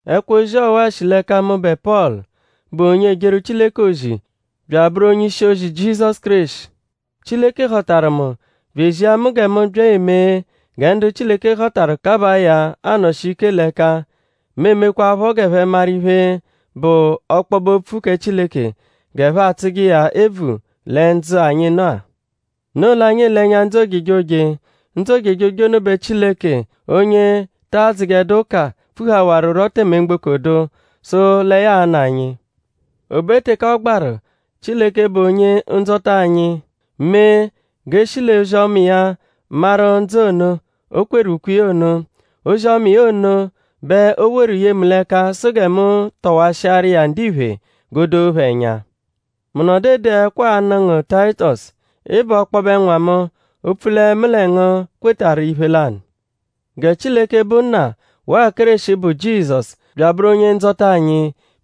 Ẹkwo-ozi ọwa-a shi l'ẹka mụbe Pọlu, bụ onye ejeru Chileke ozi bya abụru onye-ishi-ozi Jizọsu Kéreshi. Chileke họtaru mu bya ezia mu gẹ mu bya emee gẹ ndu Chileke họtaru kabaa ya anọshi ike l'ẹka; mu emekwaaphọ g'ẹphe maru iphe, bụ ọkpobe-opfu kẹ Chileke; g'ẹphe atsụje iya ebvu lẹ ndzụ-a, anyi nọ-a; noo l'anyi ele ẹnya ndzụ ojejoje. Ndzụ ojejoje ono bẹ Chileke, onye ta adzụjedu ụka pfuhawarurọ tẹme mgboko dụ; sụ lẹ ya a-nụ anyi. O be teke ọ gbaru; Chileke, bụ Onye-Ndzọta anyi mee g'e shi l'ozi-ọma iya maru ndzụ ono, o kweru ukwe iya ono. Ozi-ọma iya ono bẹ o woru ye mu l'ẹka sụ gẹ mu tọwashiaru iya ndiphe g'o doo phẹ ẹnya. Mu nọdu ede ẹkwo-a anụ ngu Tayitọsu. Ị bụ ọkpobe nwa mu; opfu lẹ mu lẹ ngu kwetarụ iphe lanụ! Gẹ Chileke, bụ Nna; waa Kéreshi, bụ Jizọsu bya abụru Onye-Ndzọta anyi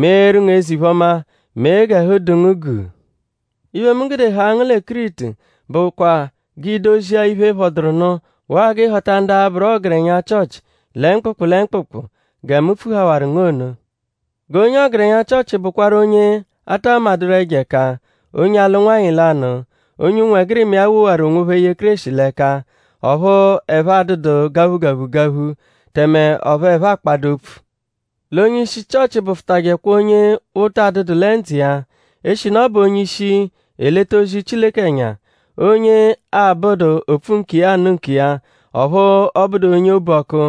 meeru ngu eze-iphe-ọma; mee g'ẹhu dụ ngu guu. Iphe, mu gude haa ngu lẹ Kiritu bụkwa g'i dozia iphe, phọduru nụ; waa g'ị họta ndu a-bụru ọgerenya Chịochi lẹ mkpụkpu lẹ mkpụkpu gẹ mu pfuhawaru ngu ono. G'onye ọgerenya Chịochi bụkwaru onye a ta madụru ẹjo ẹka; onye alụ nwanyị lanụ; onye ụnwegirima iya wowaru onwophẹ ye Kéreshi l'ẹka; ọphu ẹphe adụdu gaphugaphugaphu; tẹme ọphu ẹphe akpadụ opfu. L'onye-ishi Chịochi bụfutajekwa onye ụta adụdu lẹ ndzụ iya; eshinu ọ bụ onye-ishi, eleta ozi Chileke ẹnya. Onye abụdu opfu-nkiya-anụ-nkiya; ọphu ọ bụdu onye obu-ọku;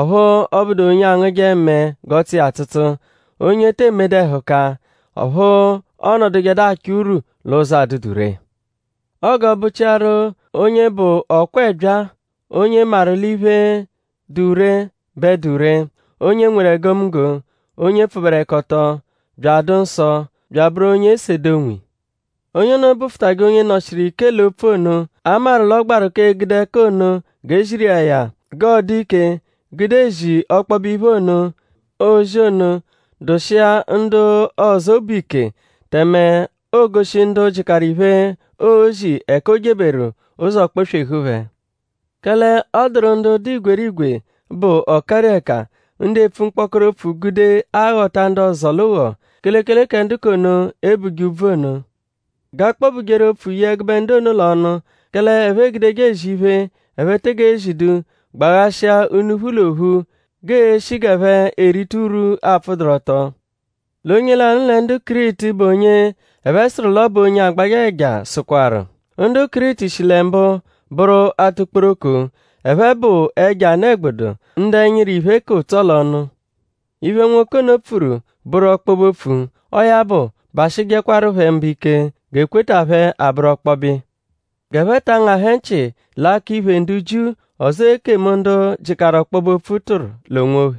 ọphu ọ bụdu onye angụje mẹe g'ọ tsụ iya atsụtsu; onye te emedu ẹhuka; ọphu ọonodujedu achọ urwu l'ụzo, adụdu ree. Ọo g'ọ bụ-chiaru onye bụ ọ-kwa-ẹbyaa; onye maru l'iphe, dụ ree bẹ dụ ree; onye nweru egomunggo; onye pfụberekoto; bya adụ nsọ; bya abụru onye esede onwiya. Onye ono bụfutaje onye nọ-shiru ike l'opfu ono, a maru l'ọ gbaru k'egude ẹka ono g'e ziru iya ya; g'ọo-dụ ike gude ezi ọkpobe iphe ono, oozi ono dụshia ndu ọzo obu ike; tẹme oogoshi ndu jịkaru iphe, oozi ẹka o jeberu; ụzo kpọ-swehu phẹ. Kẹle ọ dụru ndu dụ igwerigwe, bụ ọkarieka; ndu epfu mkpọkoro opfu gude aghọta ndu ọzo l'ụgho; kelekele kẹ ndu k'ono, e buje úbvù ono. G'a kpọ-bujeru opfu ye ẹgube ndu ono l'ọnu; kẹle ẹphe egudeje ezi iphe, ẹphe tege zidu gbaghashia unuphu l'ophu g'eeshi g'ẹphe erita urwu, apfụduru ọto. L'onye lanụ lẹ ndu Kiritu, bụ onye ẹphe sụru l'ọ bụ onye agbajẹ ẹja sụkwaru: “Ndu Kiritu shi lẹ mbụ bụru atukporoko; ẹphe bụ ẹjo anụ-ẹgbudu; ndu ẹnyiru, iphe ka ụtso l'ọnu.” Iphe nwoke ono pfuru bụru ọkpobe-opfu; ọo ya bụ; bashịjekwaru phẹ mba ike; g'ekweta phẹ abụru ọkpobe iya. G'ẹphe ta angahẹ nchị l'akọ-iphè ndu Jiu; ọzoo ekemu, ndu jịkaru ọkpobe-opfu tụru l'onwophẹ.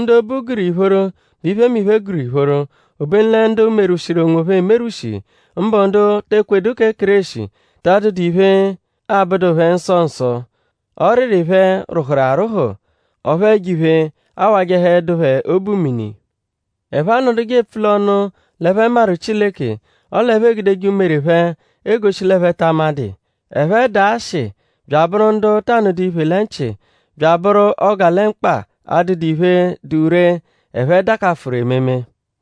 Ndu obu gụru ìphóró bẹ iphemiphe gụru ìphóró. Obenu lẹ ndu merwushiru onwophẹ emerwụshi; mbụ ndu te ekwedu kẹ Kéreshi; ta adụdu iphe, 'abụdu phẹ nsọ nsọ. Ọriri phẹ rwụhuru arwụhu; ọphu ẹjo-iphe awajẹhedu phẹ obu mini. Ẹphe anọduje epfu l'ọnu l'ẹphe maru Chileke; ọle ẹphe egudeje umere phẹ egoshi l'ẹphe ta amadụ iya. Ẹphe dụ ashị bya abụru ndu ta nụdu iphe lẹ nchị; bya bụru ọgalemkpa, adụdu iphe, dụ ree, ẹphe dakafụru ememe.